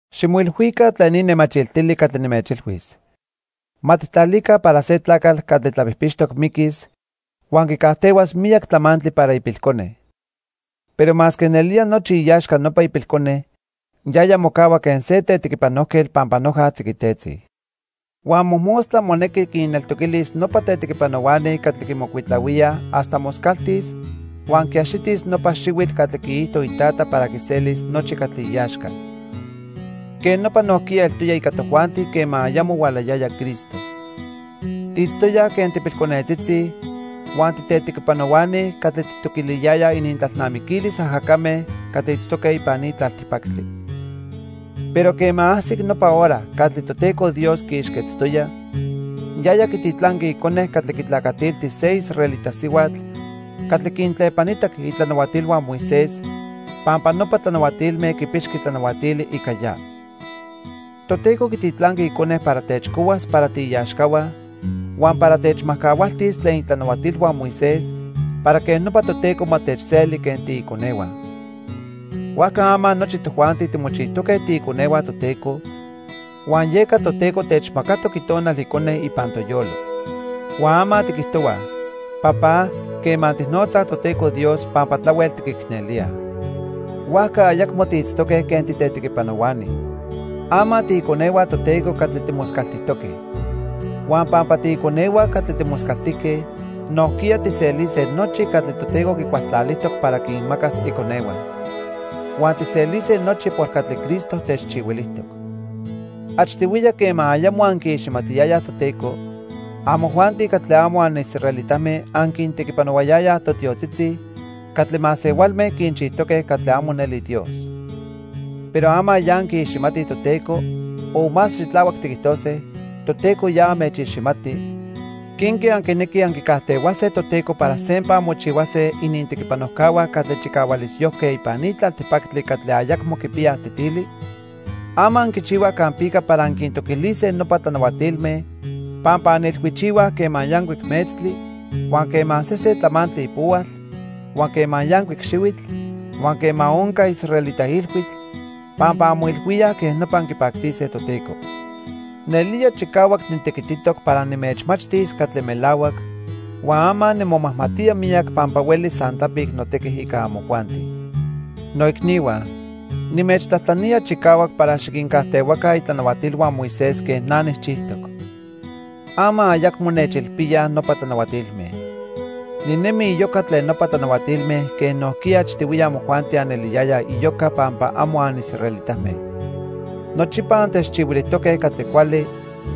Ximoilhuica tlen ni nemachiltili catli nimechilhuis. Ma tijtlalica para se tlacatl catli tlapijpixtoc miquis huan quicajtehuas miyac tlamantli para ipilcone. Pero masque nelía nochi iaxca nopa ipilcone, yaya mocahua quen se tetequipanojquetl pampa noja tziquitetzi. Huan mojmostla monequi quinneltoquilis nopa tetequipanohuani catli quimocuitlahuíaj hasta moscaltis huan quiaxitis nopa xihuitl catli quiijto itata para quiselis nochi catli iaxca. Quej nopa nojquiya eltoya ica tojuanti quema ayamo hualayaya Cristo. Tiitztoyaj quen tipilconetzitzi huan titetequipanohuani catli tijtoquiliyayaj inintlalnamiquilis ajacame catli itztoque ipan ni tlaltipactli. Pero quema ajsic nopa hora catli Toteco Dios quiixquetztoya, yaya quititlanqui Icone catli quitlacatilti se israelita sihuatl catli quintlepanitac itlanahuatilhua Moisés pampa nopa tlanahuatilme quipixqui tlanahuatili ica ya. Toteco quititlanqui Icone para techcohuas para tiiaxcahua huan para techmajcahualtis tlen itlanahuatilhua Moisés para quej nopa Toteco ma techseli quen tiiconehua. Huajca ama nochi tojuanti timochijtoque tiiconehua Toteco, huan yeca Toteco techmacatoc Itonal Icone ipan toyolo. Huan ama tiquijtohuaj: "Papá", quema tijnotzaj Toteco Dios pampa tlahuel tiquicnelíaj. Huajca ayacmo tiitztoque quen titetequipanohuani. Ama tiiconehua Toteco catli timoscaltijtoque. Huan pampa tiiconehua catli timoscaltijque, nojquiya tijselise nochi catli Toteco quicualtlalijtoc para quinmacas iconehua. Huan tijselise nochi por catli Cristo techchihuilijtoc. Achtihuiya quema ayamo anquiiximatiyayaj Toteco, amojuanti catli amo anisraelitame anquintequipanohuayayaj totiotzitzi catli masehualme quinchijtoque catli amo neli Dios. Pero ama ya anquiiximatij Toteco o más xitlahuac tiquijtose, Toteco ya anmechiximati, ¿quenque anquinequij anquicajtehuase Toteco para sempa anmochihuase inintequipanojcahua catli chicahualisyojque ipan ni tlaltipactli catli ayacmo quipiyaj tetili? Ama anquichihuaj campica para anquintoquilise nopa tlanahuatilme pampa anilhuichihuaj quema yancuic metztli, huan quema sesen tlamantli ipohual, huan quema yancuic xihuitl, huan quema onca israelita ilhuitl, pampa anmoilhuíaj quej nopa anquipactise Toteco. Nelía chicahuac nitequititoc para nimechmachtis catli melahuac, huan ama nimomajmatía miyac pampa huelis san tlapic notequi ica amojuanti. Noicnihua, nimechtlajtlanía chicahuac para xiquincajtehuaca itlanahuatilhua Moisés quen na nijchijtoc. Ama ayacmo nechilpíaj nopa tlanahuatilme. Ninemi iyoca tlen nopa tlanahuatilme quen nojquiya achtihuiya amojuanti aneliyayaj iyoca pampa amo anisraelitame. Nochipa antechchihuilijtoque catli cuali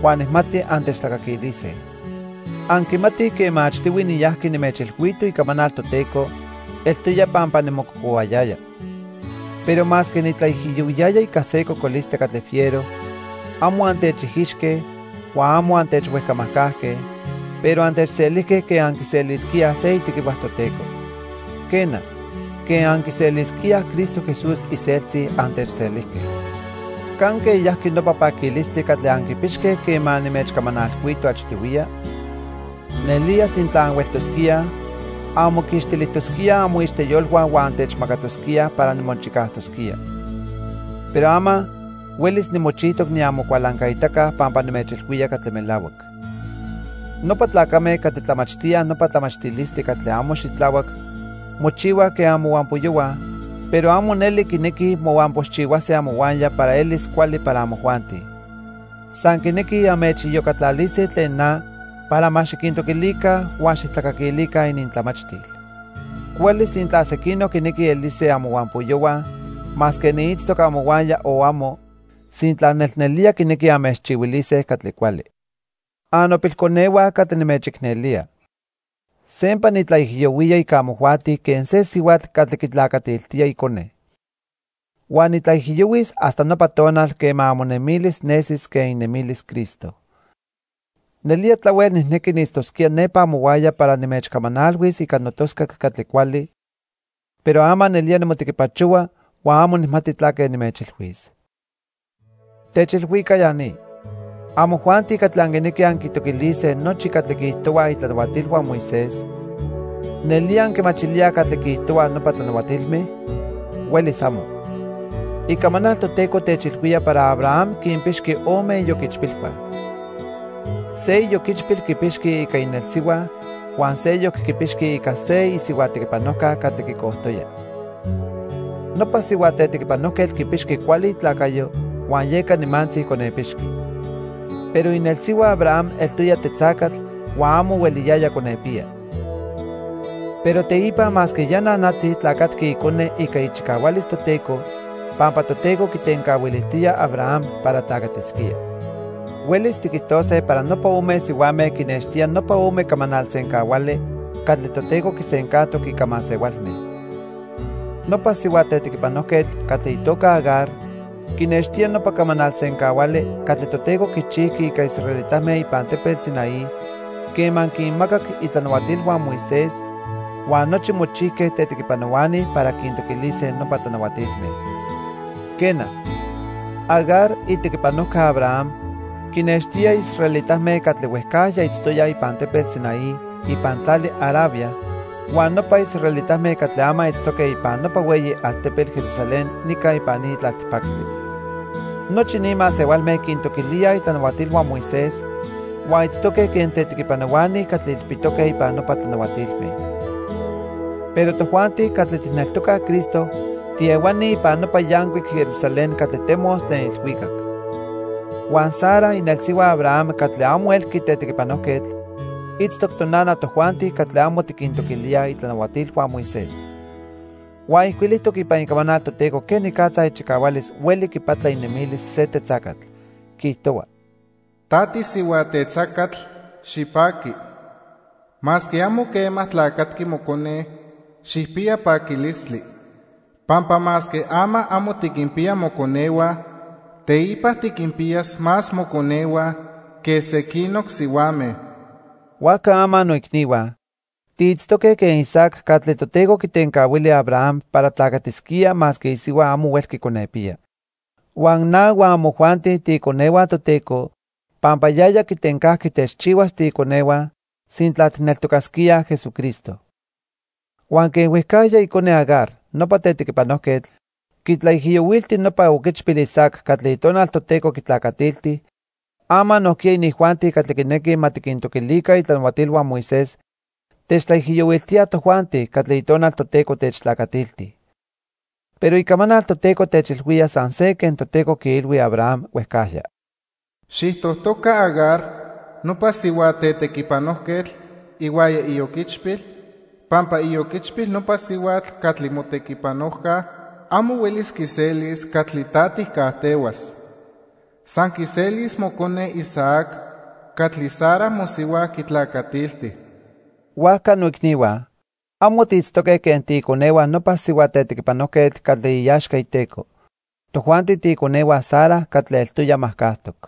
huan nijmati antechtlacaquilise. Anquimatij quema achtihui niyajqui nimechilhuito icamanal Toteco, eltoya pampa nimococohuayaya. Pero masque nitlaijiyohuiyaya ica se cocolistli catli fiero, amo antechijixque huan amo antechhuejcamajcajque, pero antechselijque quen anquiselisquíaj se itequihua Toteco. Quena, quen anquiselisquíaj Cristo Jesús iseltzi, antechselijque. ¿Canque yajqui nopa paquilistli catli anquipixque quema nimechcamanalhuito achtihuiya? Nelía sintla anhueltosquíaj, anmoquixtilijtosquíaj amoixteyolhua huan antechmacatosquíaj para nimochicajtosquía. Pero ama, huelis nimochijtoc niamocualancaitaca pampa nimechilhuía catli melahuac. Nopa tlacame catli tlamachtíaj nopa tlamachtilistli catli amo xitlahuac mochihuaj quen amohuampoyohua, pero amo neli quinequij mohuampoxchihuase amohuaya para elis cuali para amojuanti. San quinequij anmechiyocatlalise tlen na para ma xiquintoquilica huan xijtlacaquilica inintlamachtil. Cuali sintla sequinoc quinequij elise amohuampoyohua masque niitztoc amohuaya o amo, sintla nelnelía quinequij anmechchihuilise catli cuali. Annopilconehua catli nimechicnelía. Sempa nitlaijiyohuía ica amojuanti quen se sihuatl catli quitlacatiltía icone. Huan nitlaijiyohuis hasta nopa tonal quema amonemilis nesis quen inemilis Cristo. Nelía tlahuel nijnequi niitztosquía nepa amohuaya para nimechcamanalhuis ica notoscac catli cuali, pero ama nelía nimotequipachohua huan amo nijmati tlaque nimechilhuis. Techilhuica ya ni, amojuanti catli anquinequij anquitoquilise nochi catli quiijtohuaj itlanahuatilhua Moisés. ¿Nelía anquimachilíaj catli quiijtohuaj nopa tlanahuatilme? ¡Huelis amo! Icamanal Toteco techilhuía para Abraham quinpixqui ome ioquichpilhua. Se ioquichpil quipixqui ica inelsihua huan seyoc quipixqui ica se isihua tequipanojca catli quicojtoya. Nopa sihua tetequipanojquetl quipixqui cuali itlacayo huan yeca nimantzi conepixqui. Pero inelsihua Abraham eltoya tetzacatl huan amo hueliyaya conepiya. Pero teipa, masque ya nanatzi tlacatqui icone ica ichicahualis Toteco pampa Toteco quitencahuilijtoya Abraham para tlacatisquía. Huelis tiquijtose para nopa ome sihuame quinextía nopa ome camanal sencahuali catli Toteco quisencajtoc ica masehualme. Nopa sihua tetequipanojquetl catli itoca Agar quinextía nopa camanal sencahuali catli Toteco quichijqui ica israelitame ipan tepetl Sinaí quema quinmacac itlanahuatilhua Moisés huan nochi mochijque tetequipanohuani para quintoquilise nopa tlanahuatilme. Quena, Agar itequipanojca Abraham quinextía israelitame catli huejcajya itztoyaj ipan tepetl Sinaí ipan tlali Arabia huan nopa israelitame catli ama itztoque ipan nopa hueyi altepetl Jerusalén nica ipan ni tlaltipactli. Nochi ni masehualme quintoquilíaj itlanahuatilhua Moisés huan itztoque quen tetequipanohuani catli ilpitoque ipan nopa tlanahuatilme. Pero tojuanti catli tijneltocaj Cristo tiehuani ipan nopa yancuic Jerusalén catli temos tlen ilhuicac. Huan Sara inelsihua Abraham catli amo elqui tetequipanojquetl, itztoc tonana tojuanti catli amo tiquintoquilíaj itlanahuatilhua Moisés. Huan ijcuilijtoc ipan Icamanal Toteco quenicatza ichicahualis hueli quipatla inemilis se tetzacatl. Quiijtohua: "Ta tisihua tetzacatl, xipaqui. Masque amo quema tlacatqui mocone, xijpiya paquilistli. Pampa masque ama amo tiquinpiya moconehua, teipa tiquinpiyas más moconehua que sequinoc sihuame." Huajca ama noicnihua, tiitztoque quen Isaac catli Toteco quitencahuili Abraham para tlacatisquía masque isihua amo huelqui conepiya. Huan na huan amojuanti tiiconehua Toteco pampa yaya quitencajqui techchihuas tiiconehua sintla tijneltocasquíaj Jesucristo. Huan quen huejcajya icone Agar, nopa tetequipanojquetl, quitlaijiyohuilti nopa oquichpil Isaac catli Itonal Toteco quitlacatilti, ama nojquiya inijuanti catli quinequij ma tiquintoquilica itlanahuatilhua Moisés techtlaijiyohuiltíaj tojuanti catli Itonal Toteco techtlacatilti. Pero Icamanal Toteco techilhuía san se quen Toteco quiilhui Abraham huejcajya: "Xijtojtoca Agar, nopa sihua tetequipanojquetl ihuaya ioquichpil, pampa ioquichpil nopa sihuatl catli motequipanojca amo huelis quiselis catli ta tijcajtehuas. San quiselis mocone Isaac catli Sara mosihua quitlacatilti." Huajca noicnihua, amo tiitztoque quen tiiconehua nopa sihua tetequipanojquetl catli iaxca iteco. Tojuanti tiiconehua Sara catli eltoya majcajtoc.